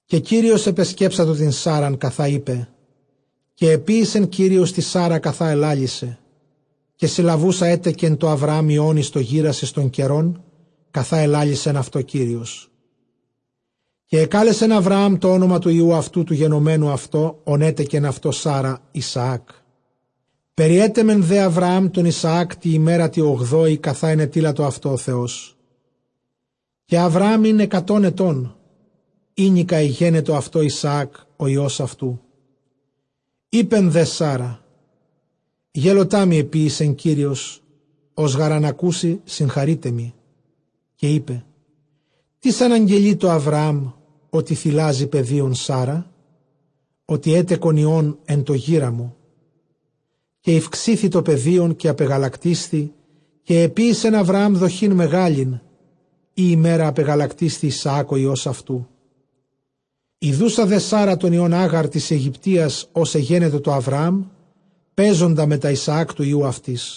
Καὶ Κύριος ἐπεσκέψατο τὴν Σάῤῥαν, καθὰ εἶπε· καὶ ἐποίησε Κύριος τῇ Σάῥῥᾳ, καθὰ ἐλάλησε. Καὶ συλλαβοῦσα ἔτεκε τῷ Ἁβραὰμ υἱὸν εἰς τὸ γῆρας, εἰς τὸν καιρὸν καθὰ ἐλάλησεν αὐτῷ Κύριος. Καὶ ἐκάλεσεν Ἁβραὰμ τὸ ὄνομα τοῦ υἱοῦ αὐτοῦ τοῦ γενομένου αὐτῷ, ὃν ἔτεκεν αὐτῷ Σάῤῥα, Ἰσαάκ· Περιέτεμε δὲ Ἁβραὰμ τὸν Ἰσαὰκ τῇ ἡμέρᾳ τῇ ὀγδόῃ, καθὰ ἐνετείλατο αὐτῷ ὁ Θεός. Καὶ Ἁβραὰμ ἦν ἑκατὸν ἐτῶν, ηνίκα ἐγένετο αὐτῷ Ἰσαὰκ ὁ υἱὸς αὐτοῦ. Εἶπε δὲ Σάῤῥα, γέλωτά μοι ἐποίησε Κύριος· ὃς γὰρ ἂν ἀκούσῃ συγχαρεῖταί μοι. Καὶ εἶπε τίς ἀναγγελεῖ τῷ Ἁβραὰμ ὅτι θηλάζει παιδίον Σάῤῥα; ὅτι ἔτεκον υἱὸν ἐν τῷ γήρᾳ μου. Καὶ ηὐξήθη τὸ παιδίον, καὶ ἀπεγαλακτίσθη· καὶ ἐποίησεν Ἁβραὰμ δοχὴν μεγάλην, ᾗ ἡμέρᾳ ἀπεκγαλακτίσθη Ἰσαὰκ ὁ υἱὸς αὐτοῦ. Ἰδοῦσα δὲ Σάῥῥα τὸν υἱὸν Ἄγαρ τῆς Αἰγυπτίας, ὃς ἐγένετο τῷ Ἁβραὰμ, παίζοντα μετὰ Ἰσαὰκ τοῦ υἱοῦ αὐτῆς,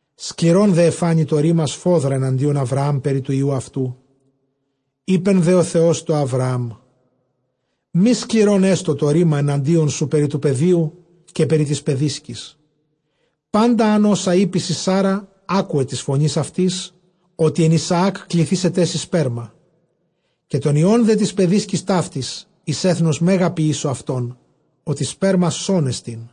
Σκληρὸν δὲ ἐφάνη τὸ ῥῆμα σφόδρα ἐνατίον Ἁβραὰμ περὶ τοῦ υἱοῦ αὐτοῦ. Εἶπε δὲ ὁ Θεὸς τῷ Ἁβραὰμ, μὴ σκληρὸν ἔστω ἐναντίον σου περὶ τοῦ παιδίου, καὶ περὶ τῆς παιδίσκης· πάντα ὅσα ἂν εἴπῃ σοι Σάῤῥα, ἄκουε τῆς φωνῆς αὐτῆς· ὅτι ἐν Ἰσαὰκ κληθήσεταί σοι σπέρμα. Καὶ τὸν υἱὸν δὲ τῆς παιδίσκης ταύτης εἰς ἔθνος μέγα ποιήσω αὐτὸν, ὅτι σπέρμα σόν ἐστιν.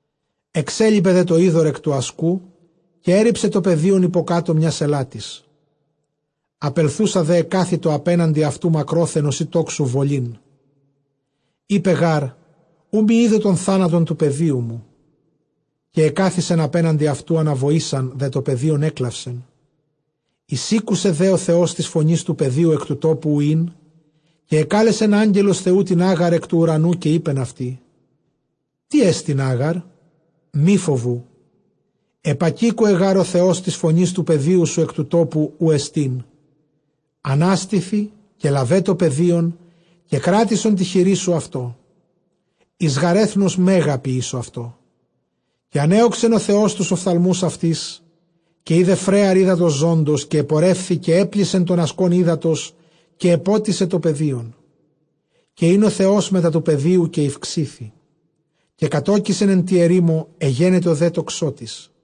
Ἐξέλιπε δὲ τὸ ὕδωρ ἐκ τοῦ ἀσκου· καὶ ἔῤῥιψε τὸ παιδίον ὑποκάτω μιᾶς ἐλάτης· Ἀπελθοῦσα δὲ ἐκάθητο ἀπέναντι αὐτοῦ μακρόθεν, ὡσεὶ τόξου βολήν· εἶπε γὰρ, οὐ μὴ ἴδω τὸν θάνατον τοῦ παιδίου μου. καὶ ἐκάθισεν ἀπέναντι αὐτοῦ· ἀναβοῆσαν δὲ τὸ παιδίον ἔκλαυσεν. Εἰσήκουσε δὲ ὁ Θεὸς τῆς φωνῆς τοῦ παιδίου ἐκ τοῦ τόπου οὗ ἦν· καὶ ἐκάλεσεν ἄγγελος Θεοῦ τὴν Ἄγαρ ἐκ τοῦ οὐρανοῦ, καὶ εἶπεν αὐτῇ, τί ἐστιν Ἄγαρ; μὴ φοβοῦ· ἐπακήκοε γὰρ ὁ Θεὸς τῆς φωνῆς τοῦ παιδίου ἐκ τοῦ τόπου οὗ ἐστιν. Ἀνάστηθι καὶ λάβε τὸ παιδίον, καὶ κράτησον τῇ χειρί σου αὐτό· εἰς γὰρ ἔθνος μέγα ποιήσω αὐτό. Καὶ ἀνέῳξεν ὁ Θεὸς τοὺς ὀφθαλμοὺς αὐτῆς· καὶ εἶδε φρέαρ ὕδατος ζῶντος, καὶ ἐπορεύθη, καὶ ἔπλησε τὸν ἀσκὸν ὕδατος, καὶ ἐπότισε τὸ παιδίον. Καὶ ἦν ὁ Θεὸς μετὰ τοῦ παιδίου· καὶ ηὐξήθη, καὶ κατῴκησεν ἐν τῇ ἐρήμῳ· ἐγένετο δὲ τοξότης.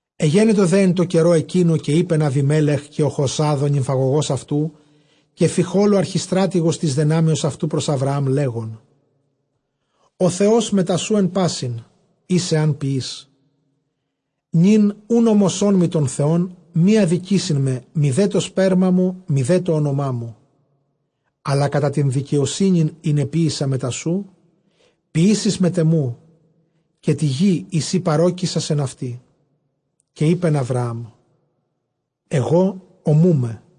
Ἐγένετο δὲ ἐν τῷ καιρῷ ἐκείνῳ, καὶ εἶπεν Ἀβιμέλεχ, καὶ Ὁχοζὰθ ὁ νυμφαγωγὸς αὐτοῦ, καὶ Φιχὸλ ὁ ἀρχιστράτηγος τῆς δυνάμεως αὐτοῦ, πρὸς Ἁβραὰμ, λέγων, ὁ Θεὸς μετὰ σοῦ ἐν πᾶσιν, οἷς ἐὰν ποιῇς. Νῦν οὖν ὄμοσόν μοι τὸν Θεὸν μὴ ἀδικήσειν με, μηδὲ τὸ σπέρμα μου, μηδὲ τὸ ὄνομά μου· ἀλλὰ κατὰ τὴν δικαιοσύνην ἣν ἐποίησα μετὰ σοῦ, ποιήσεις μετʼ ἐμοῦ, καὶ τῇ γᾗ, ᾗ σὺ παρῴκησας ἐν αὐτῇ. Καὶ εἶπεν Ἁβραὰμ, ἐγὼ ὀμοῦμαι.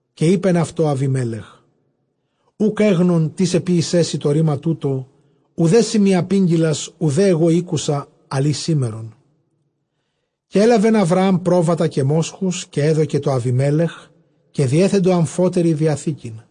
Καὶ εἶπεν αὐτῷ Ἀβιμέλεχ, οὐκ ἔγνων τίς ἐποίησέ σοι τὸ ῥῆμα τοῦτο· οὐδὲ σύ μοι ἀπήγγειλας, οὐδὲ ἐγὼ ἤκουσα, ἀλλʼ ἢ σήμερον. Καὶ ἔλαβεν Ἁβραὰμ πρόβατα καὶ μόσχους, καὶ ἔδωκε τῷ Ἀβιμέλεχ· καὶ διέθεντο ἀμφότεροι διαθήκην.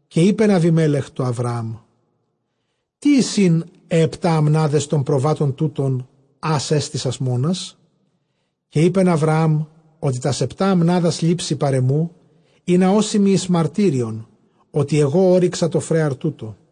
Καὶ εἶπεν Ἀβιμέλεχ τῷ Ἁβραὰμ, τί εἰσιν αἱ ἑπτὰ ἀμνάδες τῶν προβάτων τούτων, ἃς ἔστησας μόνας; Καὶ εἶπεν Ἁβραὰμ, ὅτι τὰς ἑπτὰ ἀμνάδας λήψῃ παρʼ ἐμοῦ, ἵνα ὦσι μοι εἰς μαρτύριον, ὅτι ἐγὼ ὤρυξα τό φρέαρ τοῦτο.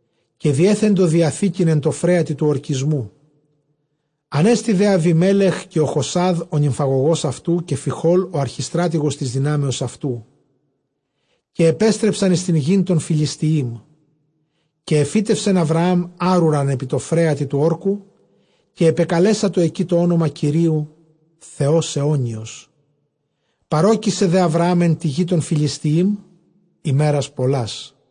Καὶ διέθεντο διαθήκην ἐν τῷ φρέατι τοῦ ὁρκισμου· ἀνέστη δὲ Ἀβιμέλεχ, Ὁχοζὰθ ὁ νυμφαγωγὸς αὐτοῦ, καὶ Φίχολ ὁ ἀρχιστράτηγος τῆς δυνάμεως αὐτοῦ, καὶ ἐπέστρεψαν εἰς τὴν γῆν τῶν Φυλιστιείμ. Καὶ ἐφύτευσεν Ἁβραὰμ ἄρουραν ἐπὶ τῷ φρέατι τοῦ ὅρκου· καὶ ἐπεκαλέσατο ἐκεῖ τὸ ὄνομα Κυρίου, Θεὸς αἰώνιος. Παρῴκησε δὲ Ἁβραὰμ ἐν τῇ γῇ τῶν Φυλιστιεὶμ ἡμέρας πολλάς.